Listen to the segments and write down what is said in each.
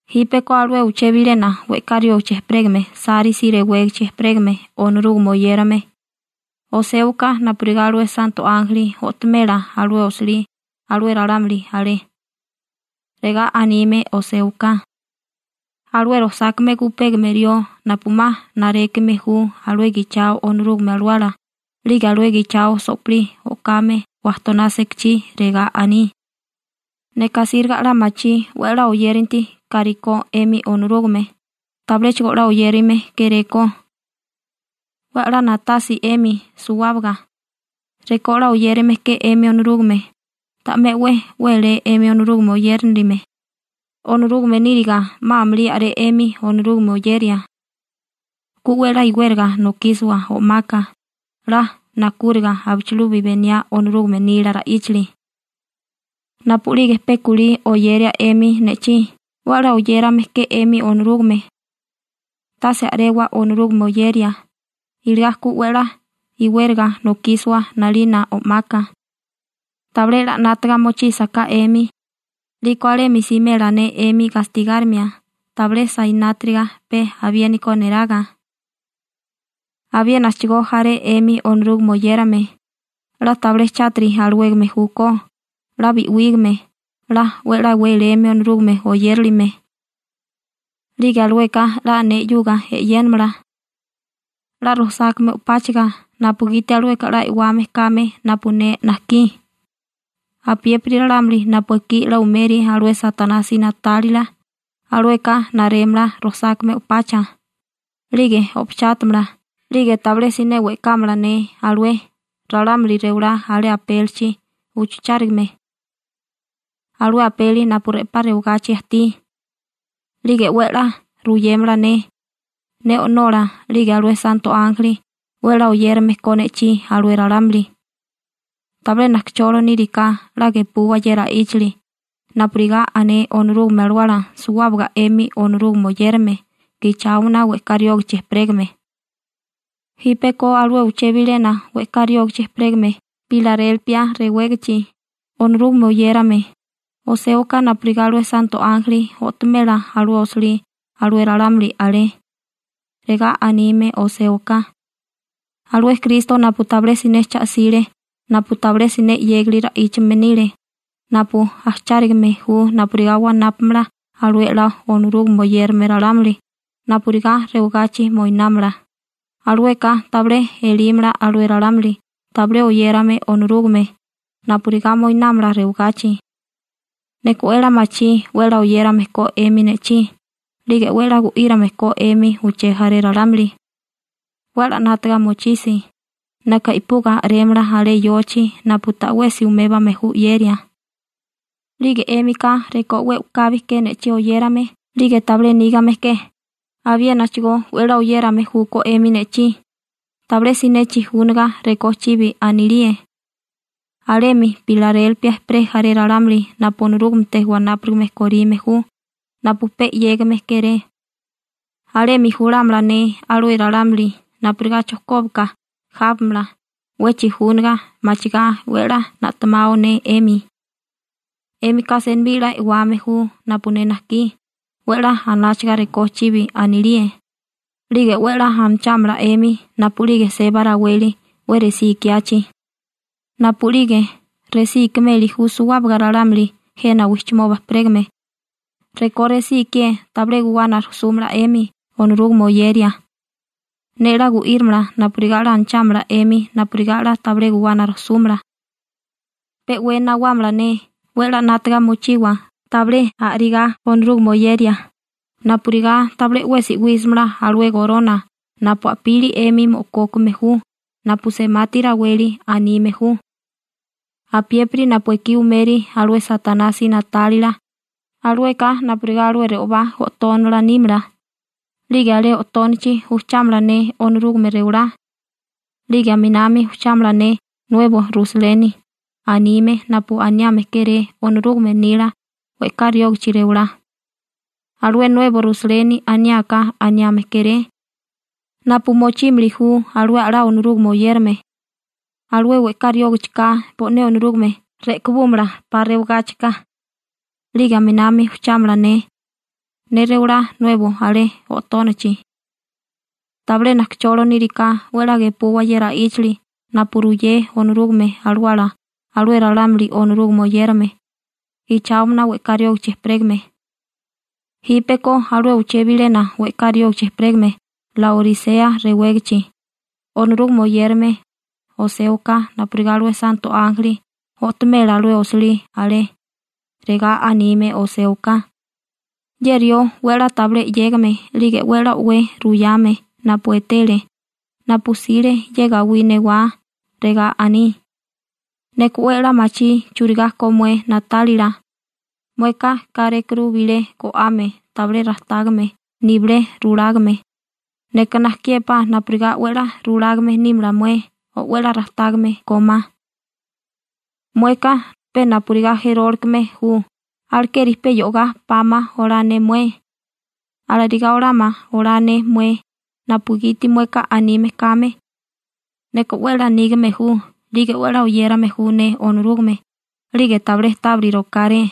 › Jípeko alué uché bilena we'ká riógichi ejperégame Sárisi rewégichi ejperégame Onorúgame oyérame, oséwaká napurigá alué santo ánjeli o'tomela alué osilí alué ralámuli alé. Regá anime oséwaká: Alué rojsákame gupégame rió napu 'ma narékame ju alué gichao Onorúgame Alawala 'lige alué gichao so'pilí o'kame wajtoná sekachí, regá aní: «Neka asíriga 'la machí 'we 'la oyéranti kárikó 'emi Onorúgame, tabiléchigo 'la oyérame kéréko. 'We 'la na'tasi 'emi suwábaga, rekó 'la oyérame ke 'emi Onorúgame, ta'mé 'we wélé 'emi Onorúgame oyérilime, Onorúgame níriga 'ma amulí a'ré 'emi Onorúgame oyeria. Ku 'we 'la iwériga nokísiwa o'maka 'la nakúriga abichilubi beniá Onorúgame nila ra'íchali. Napu'lige pe kulí oyeria 'emi ne'chí, 'we 'la oyérame ke 'emi Onorúgame. Tase a'rewa Onorúgame oyeria, iligá ku 'we 'la iwériga nokísiwa 'nalina o'maka. Tabilé 'la 'nátaga mochísaká 'emi, 'liko alemi simela ne 'emi gastigárimia tabilé sainátiriga pe abiéniko neraga. Abiénachigo jaré 'emi Onorúgame oyérame 'la tabilé chátiri alawégame júkó, 'la bi'wígame, 'la 'we 'la wéléme Onorúgame oyérilime, 'lige alueka 'la ne 'yuga e'yénamala 'la rojsákame o'páchaga napugiti alueka 'la e'wame kame napu ne najkí. Apiépiri ralámuli napu ekí 'la umeri alué Satanasi na'tálila, alueka narémala rojsákame o'pacha, 'lige o'pachátamala, 'lige tabilé siné we'kámala ne alué ralámuli rewalá alé apélichi uchuchárigame, alué apeli napu re'pá rewagachi ajtí. 'Lige 'we 'la ruyémala ne, ne O'nola 'lige alué santo ánjeli 'we 'la oyérame ko ne'chí alué ralámuli. Tabilé najkacholo níriká 'la gepuwa ye ra'íchali napurigá ané Onorúgame Alawala suwábaga 'emi Onorúgame oyérame gicháomana we'ká riógichi ejperégame.» › Jípeko alué uché bilena we'ká riógichi ejperégame Pilarélpia rewégichi, Onorúgame oyérame, oséwaká napurigá alué santo ánjeli o'tomela alué osilí alué ralámuli alé. Regá anime oséwaká: «Alué Kristo napu tabilé siné cha 'sile, napu tabilé siné 'yégali ra'íchame nile, napu ajchárigame ju napurigá wanápamala alué 'la Onorúgame oyérame ralámuli napurigá rewagachi moinámala, alueka tabilé elímala alué ralámuli tabilé oyérame Onorúgame napurigá moinámala rewagachi. Neka 'we 'la machí 'we 'la oyérame ko 'emi ne'chí 'lige 'we 'la gu'írame ko 'emi uché jaré ralámuli. 'We 'la 'nátaga mochisi, neka i'puga a'rémala alé yochi napu ta'wesi umébame ju 'yeria. 'Lige 'émika rekó 'we u'kabi ke ne'chí oyérame 'lige tabilé nígame ke, abiénachigo 'we 'la oyérame júkó 'emi ne'chí tabilé siné chijúniga rekó chibi anilíe. Alemi Pilarélpia ejperé jaré ralámuli napu Onorúgamete wanápurigame korime ju napu pe 'yégame kéré, alemi julámala ne alué ralámuli napurigá chojkóbaka jábamala 'we chijúniga machigá 'we 'la na'temao ne 'emi. 'Émika senibí 'la e'wame ju napu ne najkí 'we 'la anáchaga rekó chibi anilíe, 'lige 'we 'la anachámala 'emi napu'lige seba raweli 'we resí ikiachi, napu'lige resí ikimeli ju suwábaga ralámuli jena wijchimoba ejperégame, rekó resí ikié tabilé guwana rujsúmala 'emi Onorúgame oyeria. Ne 'la gu'írimala napurigá 'la anachámala 'emi napurigá 'la tabilé guwana rujsúmala. Pe 'we nawámala ne, 'we 'la 'nátaga mochiwa tabilé a'rigá Onorúgame oyeria, napurigá tabilé 'wesi 'wísimala alué gorona napu a'pili 'emi mo'kókame ju napu semati raweli anime ju. Apiépiri napu ekí umeri alué Satanasi na'tálila, alueka napurigá alué re'obá o'tónala nímala, 'lige alé o'tónachi ujchámala ne Onorúgame rewalá, 'lige aminami ujchámala ne «Nuebo Rusaleni» anime napu aniame kéré Onorúgame nila we'ká riógichi rewalá. Alué Nuebo Rusaleni aniáká anime kéré napu mochímili ju alué 'la Onorúgame oyérame. Alué we'ká riógachiká bo'né Onorúgame re'kibúmala 'pa rewagáchika. 'Lige aminami ujchámala ne, ne rewalá nuebo alé o'tónachi. Tabilé najkacholo níriká 'we 'la gepuwa ye ra'íchali napu ruyé Onorúgame Alawala alué ralámuli Onorúgame oyérame, gicháomana we'ká riógichi ejperégame.» › Jípeko alué uché bilena we'ká riógichi ejperégame Laorisea rewégachi, Onorúgame oyérame, oséwaká napurigá alué santo ánjeli o'tomela alué osilí alé. Regá anime oséwaká: «Ye rió 'we 'la tabilé 'yégame 'lige 'we 'la o'wé ruyame napu etele, napu 'sile ye gawí newá, regá aní: Neka 'we 'la machí churigá ko mué na'tálila. Mueka kárékuru bilé go'ame tabilé rajtágame nibilé rulágame. Neka najkiépá napurigá 'we 'la rulágame nímala mué, o 'we rajtágame kómá. Mueka pe napurigá jerólikeme ju, alekeri pe yo'gá pama olá ne mué. Alarigá olama olá ne mué napugiti mueka anime kame: Neka 'we 'la nígame ju 'lige 'we 'la oyérame ju ne Onorúgame 'lige tabilé tábiri rokáré.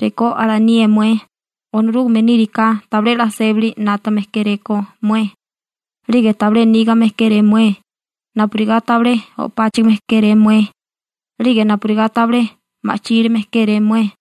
Rekó alanié mué, Onorúgame níriká tabilé 'la sébali 'nátame kéréko mué, 'lige tabilé nígame kéré mué, napurigá tabilé o'páchigime kéré mué, 'lige napurigá tabilé ma'chílime kéré mué.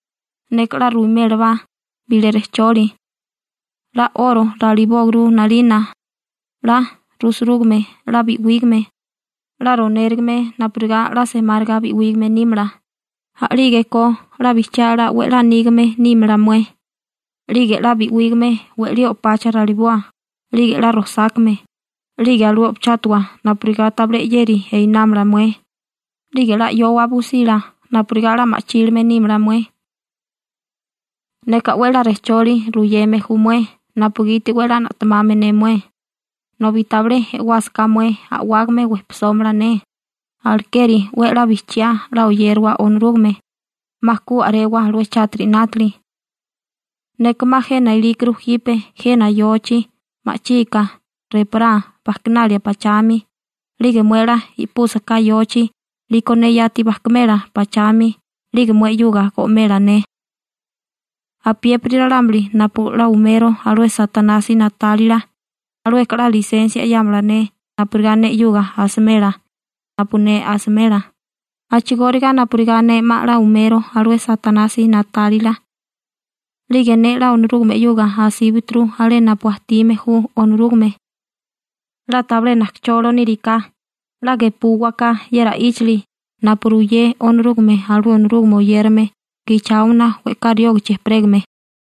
Neka 'la ruimélabá bilé rejcholi: 'La 'oro ralibóguru 'nalina 'la rusurúgame 'la bi'wígame, 'la ronérigame napurigá 'la semáriga bi'wígame nímala, a'lígeko 'la bijchiá 'la 'we a'lá nígame nímala mué. 'Lige 'la bi'wígame we'lí o'pacha raliboa, 'lige 'la rojsákame, 'lige alué o'pachátawa napurigá tabilé 'yeri einámala mué, 'lige 'la 'yowa busila napurigá 'la ma'chílime nímala mué. Neka 'we 'la rejcholi ruyeme ju mué napugiti 'we 'la na'temame ne mué, nobi tabilé e'wásaká mué a'wágame wejpisómala ne, alekeri 'we 'la bijchiá 'la oyériwa Onorúgame, 'ma ku a'rewa alué chátiri 'nátili. Ne 'ma jena ilíkuru jipe jena yochi ma'chika reporá bajkinalia pachami, 'lige mué 'la i'púsaká yochi 'liko ne yati bajkimela pachami 'lige mué 'yuga go'mela ne. Apiépiri ralámuli napu 'la umero alué Satanasi na'tálila, alueka 'la lisensia 'yámala ne napurigá ne 'yuga asimela napu ne asimela, a'chigóriga napurigá ne 'ma 'la umero alué Satanasi na'tálila 'lige ne 'la Onorúgame 'yuga asíbaturu alé napu ajtime ju Onorúgame. 'La tabilé najkacholo níriká 'la gepúwaká ye ra'íchali napu ruyé Onorúgame alué Onorúgame oyérame gicháomana we'ká riógichi ejperégame.»